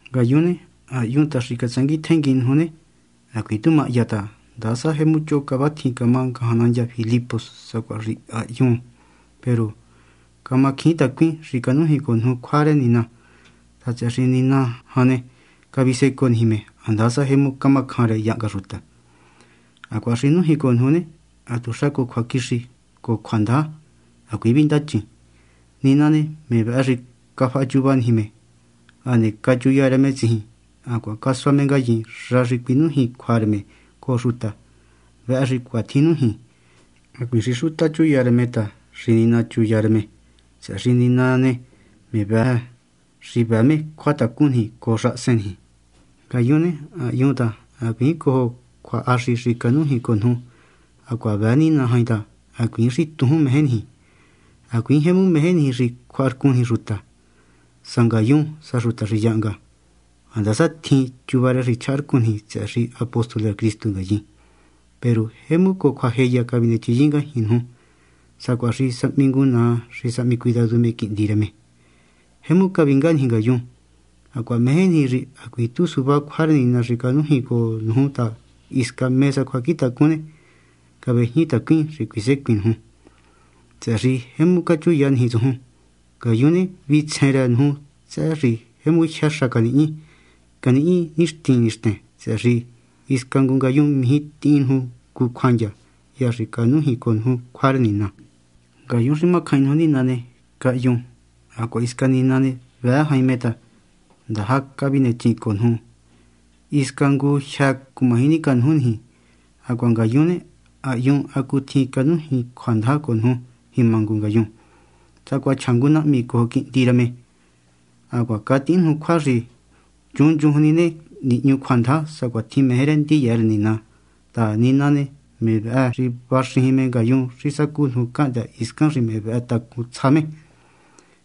Ngayun ne, ha hyun ta xi catsanguin tjenguin nuju ne, hacuiin tu mahya ta handasa jemu choho cavatjin camá ngajan nandya Filipos sacuatjin xi ha hyun, peru camacjiin tacuin xi canújin cojo nuju cjua rë Nina ta, tsëhë xi Nina jan ne, cavisecoo niji me, handasa jemu camacjan rë yahnga xuta. Hacuaha xi nújin cojo nuju ne, hatuxa cojo cjuaquixi cojo cjuandaja. Hacuiin vindachin. Nina ne, me vëhë xi cafahachuva niji me, hane cachuya rë me tsijin, hacuaha casua me ngayin xa xi cuinújin cjua rë me cojo xuta. Vëhë xi cuatjin nújin. Hacuiin xi xuta chuya rë me ta xi Nina chuya rë me, tsëhë xi Nina ne, me vëhë xi vëë me cjuatacun niji cojo xahasen niji. Ngayun ne, ha hyun ta hacuiin cjuahaxi xi canújin cojo nuju, hacuaha vëë Nina jain ta hacuiin xi tujún meje niji. Hacuiin jemu meje niji xi cjuaharcun niji xuta, sa ngayun sa xuta xi yahnga, handasa tjin niji chuva rë xi chjaharcun niji tsëhë xi apóstol rë Cristu ngayin. Peru jemu cojo cjuajeya cavinechin ngajñi nuju, sacuaha xi sahmi ngu naa xi sahmi cuidadu me quihndi rë me. Jemu cavinga niji ngayun. Hacuaha meje niji xi hacuiin tu suvá cjua rë Nina xi canújin cojo nuju ta hisca mé sa cjuacjintacun ne, cavejñitacuin xi cuisecuin nuju ta, tsëhë xi jemu cachuya niji tsujun. Ngayun ne, vitsjen rë nuju tsëhë xi jemu jyë xa canihñi. Canihñi nixtin nixten, tsëhë xi hisca ngu ngayun mijí tihin nuju ngu cjuandya hya xi canújin cojo nuju cjua rë Nina. Ngayun xi macjain nuju Nina ne, cahyun, hacuaha hisca Nina ne, vëë jain me ta jemu ndaja cavinechin cojo nuju. Hisca ngu jyë́ cumaji nicanuju niji. Hacuaha ngayun ne, ha hyun hacutjin canújin cjuandaja cojo nuju jima ngu ngayun, sacuaha chja ngu nahmi cojo quihndi rë me. Hacuaha catihin nuju cjua xi nchunchujun ni ne, nihñu cjuandaja sacuatjin meje rë ndiya rë Nina ta, Nina ne, me vëhë xi vaxijin me ngayun xi sacú nuju cahndë́ hiscan xi me vëhë tacun tsja me.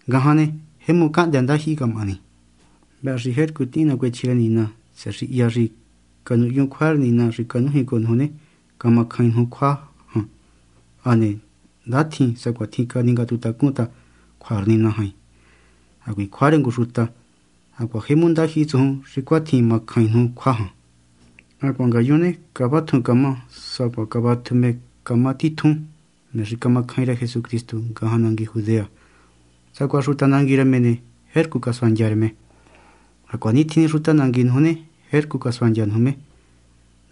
Ngajan ne, jemu cahndë́ ndajyihi camahani. Vëhë xi jercu tihin nacuechji rë Nina, tsëhë xi hya xi canuhyun cjua rë Nina xi canújin cojo nuju ne, camacjain nuju cjua jan. Hane ndatjin sacuatjin caningatuhuntacun ta cjua rë Nina jain, hacuiin cjua rë ngu xuta. Hacuaha jemu ndajyihi tsujun xi cuatjin macjain nuju cjua jan. Hacuaha ngayun ne, cavatjun camá sacuaha cavatju me camá titjun, me xi camacjain rë Jesucristu ngajan nangui Judea. Sacuaha xuta nangui rë me ne, jercu casuandya rë me, hacuanitjin ni xuta nangui nuju ne, jercu casuandya nuju me.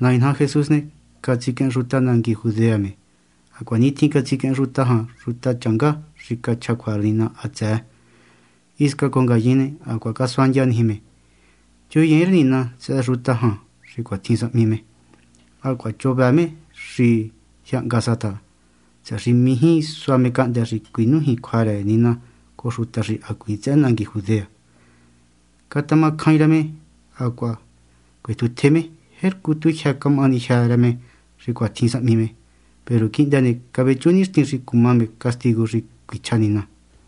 Nai naja Jesús ne, catsiquehen xuta nangui Judea me, hacuanitjin catsiquehen xuta jan xutachanga xi cachja cjua rë Nina hatsëë. Hisca cojo ngayin ne, hacuaha casuandya niji me. Chuyiin rë Nina tsëhë xuta jan xi cuatjin sahmi me. Hacuaha choho vëë me me xi yahnga sa ta, tsëhë xi mijí sua me cahndë́ xi cuinújin cjua rë Nina cojo xuta xi hacuiin tsëhë nangui Judea ne, catamacjain rë me hacuaha cuetjutje me. Jercu tu jyë camahani jyë́ rë me xi cuatjin sahmi me. Peru quihndë ne, cavechu nixtin xi cuma me castigu xi cuichja Nina.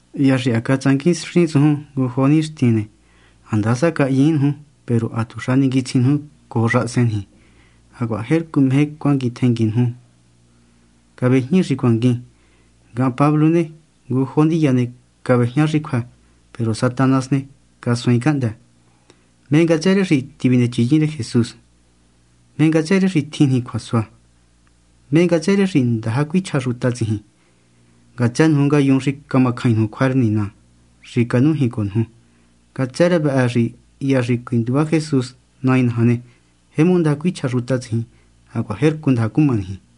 Hya xi ha catsanguinxin ngu jo nixtin tsujun ne, handasa cahyiín nuju, peru hatuxa ninguitsjin nuju cojo xahasen niji. Hacuaha jercu meje cuanguin tjenguin nga nuju. Cavejñi xi cuanguin. Ngahan Pablo ne, ngu jo ndiya ne, cavejñá xi cjuë́, peru Satanás ne, casuaain cahndë́. ¿Mé ngatsë rë xi tivinechinyin rë Jesús? ¿Mé ngatsë rë xi tjin niji cjuasua? ¿Mé ngatsë rë xi ndaja cuichja xuta tsijin? Ngatsë nuju ngayun xi camacjain nuju cjua rë Nina xi canújin cojo nuju. Ngatsë rë vëhë xi hya xi cuinduva Jesús Nai naja ne, jemu ndaja cuichja xuta tsijin hacuaha jercu ndaja cuma niji.